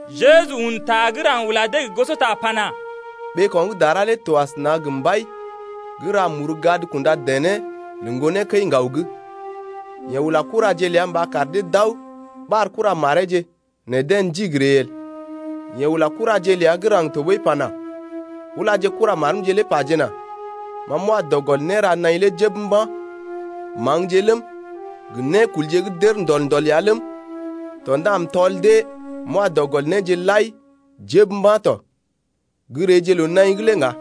Jeju un ta gə́ raŋg ula dee gə gosota pana: Ɓeeko̰ gə́ dara lé to asəna gə mbai gə́ ra muru gad kunda dené lə ŋgonee kəi-ŋgaw’g. Yeḛ ula kuraje ləa mba kar dee d’aw ɓar kuramareeje nɛ deḛ ndigi ree el. Yeḛ ula kuraje ləa gə́ raŋg tɔɓəi pana: Ulaje kuramarmje lé pajena: Ma m’wa dɔ gɔl né ra naḭ lé jəb mba̰, maŋgje ləm, gə nékulje gə́ d’ər ndɔl-ndɔl ya ləm tɔ ndá m’tɔl dee m’wa dɔ gɔl néje lai jəb mba̰ tɔ. Gə́ reeje loo-naḭ’g lé ŋga.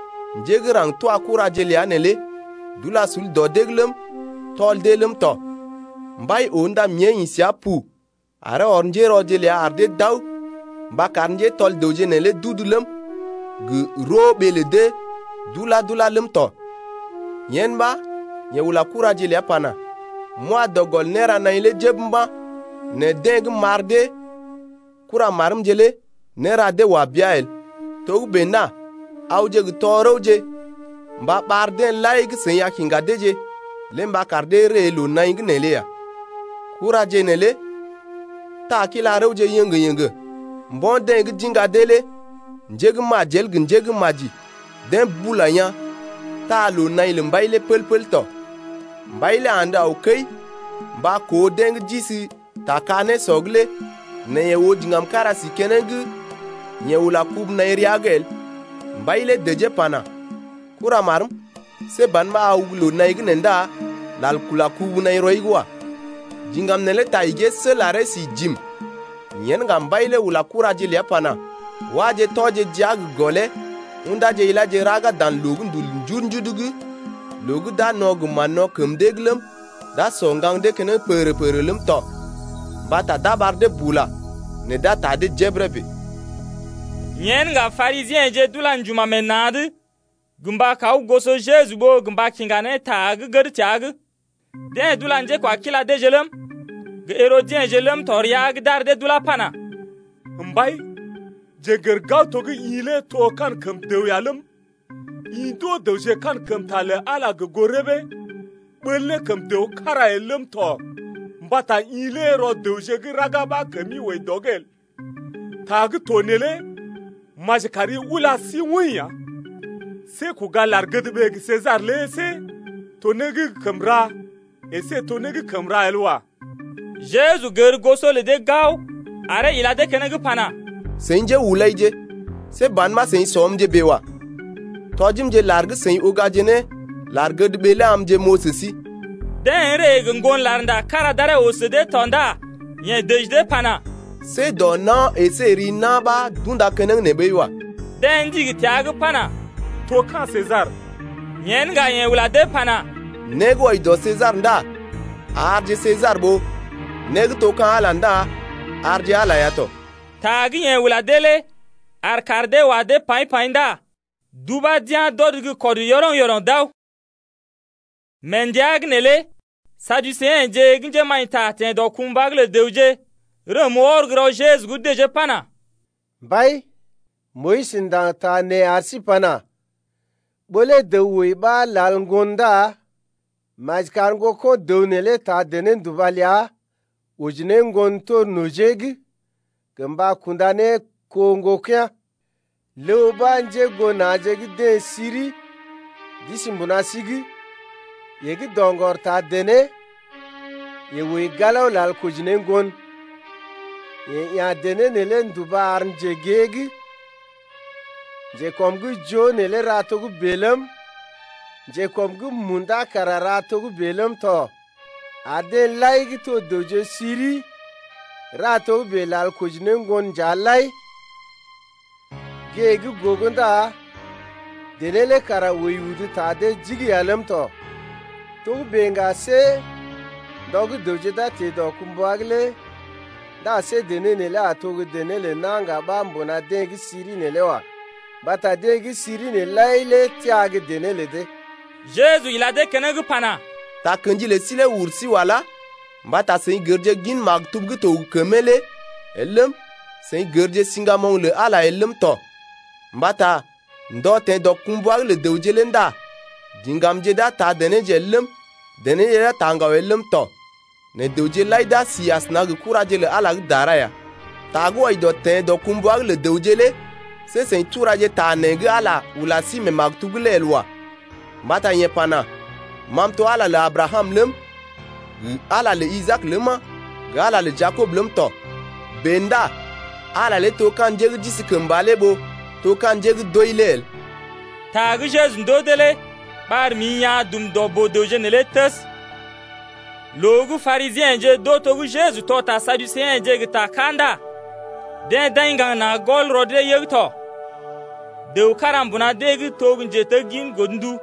njé gə́ raŋg twa kuraje ləa neelé d’ula sul dɔ dee’g ləm, tɔl dee ləm tɔ. Mbai lé oo ndá mée ḭ səa pu aree ɔr njérɔje ləa ar dee d’aw mba kar njétɔl dəwje neelé d’udu ləm, gə roo ɓee lə dee dula-dula ləm tɔ. Yen ɓa yeḛ ula kuraje ləa pana: M’wa dɔ gɔl né ra naḭ lé jəb mba̰, nɛ deḛ gə́ m’ɓar dee kuramarmje lé néra dee wa bea el. Togə́bè ndá awje gə tɔ-rəwje mba ɓar deḛ lai gə́ seḭ a kiŋga deeje lé mba kar dee ree loo-naḭ’g neelé ya. Kuraje neelé taa kila-rəwje yéŋgé-yéŋgé mbo̰ deḛ gə́ d’iŋga dee lé njé gə́ majel gə njé gə́ maji deḛ bula yaa̰, taa loo-naḭ lə mbai lé pəl-pəl tɔ. Mbai lé andə aw kəi mba koo deḛ gə́ d’isi ta ka-nésɔ’g lé nɛ yeḛ oo diŋgam kára si keneŋ gə́ yeḛ ula kubu-naḭ rəa’g el. Mbai lé dəjee pana: Kuramarm, see ban ɓa aw gə́ loo-naḭ’g nee ndá lal kula kubu-naḭ rɔi’g wa. Diŋgam neelé ta igee sel aree si jim. Yen ŋga mbai lé ula kuraje ləa pana: Wáje tɔje jia gə gɔlee ṵdáje iláje raga dan loondul gə́ ndul njudu-njudu’g loo gə́ d’a no̰ gə mán-no̰ kəm dee’g ləm, d’a sɔ ŋgaŋ dee keneŋ pəgərə-pəgərə ləm tɔ. Mbata d’a ɓar dee bula nɛ d’a taa dee jebəre bèe. Yen ŋga Parisiḛje d’ula njuma̰ meḛ na̰’d gə mba kaw goso Jeju ɓó gə mba kiŋga ne ta gə́ gəd təa’g. Deḛ d’ula njékwakila deeje ləm, gə herodiḛje ləm tɔ rəa’g d’ar dee d’ulá pana: Mbai, jeḛ n’gər gao to gə́ i lé to kankəm dəw ya ləm, i ndoo dəwje kankəmta lə Ala gə goo rəbee, ɓəl ne kəm dəw kára el ləm tɔ mbata i lé rɔ dəwje gə́ raga ɓa kəmi wəi dɔ’g el. Ta gə́ to neelé maji kar i ula sí woḭ ya. See kuga lar-gədɓee gə Sesar lé see to né gə́ kəm ra əsé to né gə́ kəm ra el wa. Jeju gər goso lə dee gao aree ila dee keneŋ pana: Seḭ njéhulaije, see ban ɓa seḭ sɔmje bèe wa. Tɔjimje lar gə́ seḭ ugaje ne lar-gədɓee lé amje m’oo sə sí. Deḛ ree gə ŋgon larnda kára d’aree oo sə dee tɔ ndá yeḛ dəji dee pana: See dɔ na̰ əsé gə ri na̰ ɓa d’unda keneŋ nee ɓəi wa. Deḛ ndigi təa’g pana: To ka̰ Sesar. Yen ŋga yeḛ ula dee pana: Né gə́ wɔji dɔ Sesar ndá arje Sesar ɓó né gə́ to ka̰ Ala lé ndá arje Ala ya tɔ. Ta gə́ yeḛ ula dee lé ar kaar dee wa dee paḭ-paḭ ndá d’ubá d’yá̰ d’ɔd gə́ kɔd yɔroŋ-yɔroŋ d’aw. Mee ndəa’g neelé Saduseḛje gə́ njémaḭta teḛ dɔkumbwa’g lə dəwje, rəm wɔr gə́ rɔ Jeju’g dəjee pana: Mbai, Moyis ndaŋg ta nee ar sí pana: Ɓó lé dəw wəi ɓa lal ŋgon ndá maji kar ŋgoko̰ dəw neelé taa dené-nduba ləa oji ne ŋgon tor nojee’d gə mba kunda ne kó ŋgokea̰ lé. Ləw ɓa njégoo na̰je’g deḛ siri d’isi mbuna sí’g. Yeḛ gə́ doŋgɔr taa dené, yeḛ wəi galao lal koji ne ŋgon, yeḛ ya̰ dené neelé nduba ar njegée’g. Njekɔm gə́ joo neelé ra togə́bè ləm, njekɔm’g munda kara ra togə́bè ləm tɔ ar deḛ lai gə́ to dəwje siri ra togə́bè lal koji ne ŋgon nja lai. Gée gə́ gogo ndá dené lé kara wəi udu ta dee jigi ya ləm tɔ. Togə́bè ŋga see ndɔ gə́ dəwje d’a teḛ dɔkumbwa’g lé ndá see dené neelé a to gə́ dené lə na̰ ŋga ɓa mbuna deḛ gə́ siri’g neelé wa. Mbata deḛ gə́ siri nee lai lé təa gə́ dené lə dee. Jeju ila dee keneŋ pana: Takə̰ji lə sí lé ur sí wala mbata seḭ gərje gin maktub gə́ to gə kəmee lé el ləm, seḭ gərje siŋgamoŋ lə Ala lé el ləm tɔ. Mbata ndɔ teḛ dɔkumbwa’g lə dəwje lé ndá diŋgamje d’a taa denéje el ləm, denéje d’a taa ŋgaw el ləm tɔ, nɛ dəwje lai d’a si asəna gə kuraje lə Ala lé gə́ dara ya. Ta gə́ wɔji dɔ teḛ dɔkumbwa’g lə dəwje lé see seḭ turaje ta nee gə́ Ala ula sí mee maktub’g lé el wa. Mbata yeḛ pana: Ma m’to Ala lé lə Abrakam ləm, gə Ala lé lə Isaak ləma, gə Ala lé lə Jakob ləm tɔ. Bèe ndá Ala lé to ka̰ njé gə́ d’isi kəmba lé ɓó to ka̰ njé gə́ d’wəi lé el. Ta gə́ Jeju ndoo dee lé ɓar mḭ yaa̰ dum dɔ boo-dəwje neelé təs. Loo gə́ Parisiḛje d’oo to gə́ Jeju tɔ ta Saduseḛje gə ta ká ndá deḛ d’aḭ ŋgaŋ na̰ gɔl rɔ dee yəg tɔ. Dəw kára mbuna dee’g to gə́ njeteggin godndu.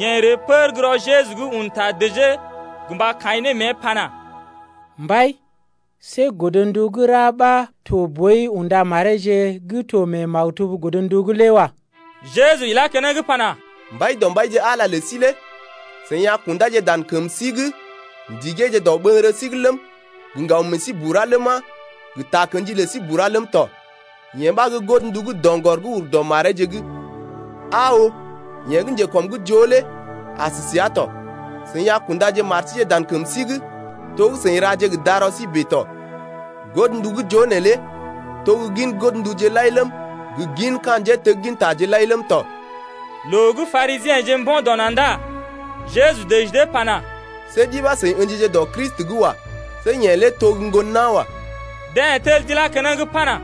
Yeḛ ree pər gə́ rɔ Jeju’g un ta dəjee gə mba kaḭ ne mée pana: Mbai, see godndu gə́ ra ɓa to boi unda mareeje gə́ to mee maktub godndu’g lé wa. Jeju ilá keneŋ pana: Mbaidɔmbaije Ala ləi lé i a kundá dan kəmi’g ndigee dɔɓəŋgəri’g ləm, gə ŋgaw məəi bura ləma, gə takə̰ji ləi bura ləm tɔ. Yee ɓa gə́ godndu gə́ doŋgɔr gə́ ur dɔ mareeje’g. Aa oo, yeḛ gə́ njekɔm’g joo lé as səa tɔ. I a kunda mari dan kəmi’g to gə́ i ra gə darɔi bèe tɔ. Dan godnduje gə́ joo neelé gin godnduje lai gə gin ka̰ njéteggintaje lai ləm d’ḭ keneŋ ləm tɔ. Loo gə́ Parisiḛje mbo̰ dɔ na̰ ndá Jeju dəji dee pana: See ɗi ɓa seḭ ə̰jije dɔ Kristi’g wa. See yeḛ lé to gə́ ŋgon nawa. Deḛ tel d’ilá keneŋ pana: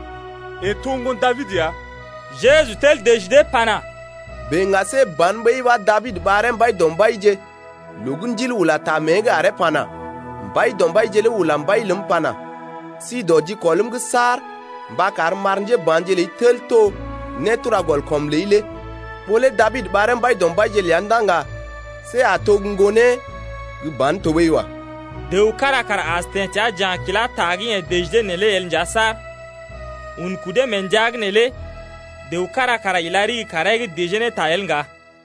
Yeḛ to ŋgon Dabid ya. Jeju tel dəji dee pana: Bèe ŋga see ban ɓəi ɓa Dabid ɓaree Mbaidɔmbaije loo gə́ Ndil ula ta mée’g aree pana: Mbaidɔmbaije lé ula Mbai ləm pana: Si dɔ jikɔlm’g saar Mba karm m’ar njéba̰je ləi tel to nétura-gɔl-kɔm ləi lé. Ɓó lé Dabid ɓaree Mbaidɔmbaije ləa ndá ŋga see a to gə́ ŋgonee gə́ ban tɔɓəi wa. Dəw kára kara as teḛ təa ja̰ kila ta gə́ yeḛ dəji dee neelé el nja saar. Un kudee mee ndəa’g neelé dəw kára kara ila ɗigi kaaree’g dəjee ne ta el ŋga.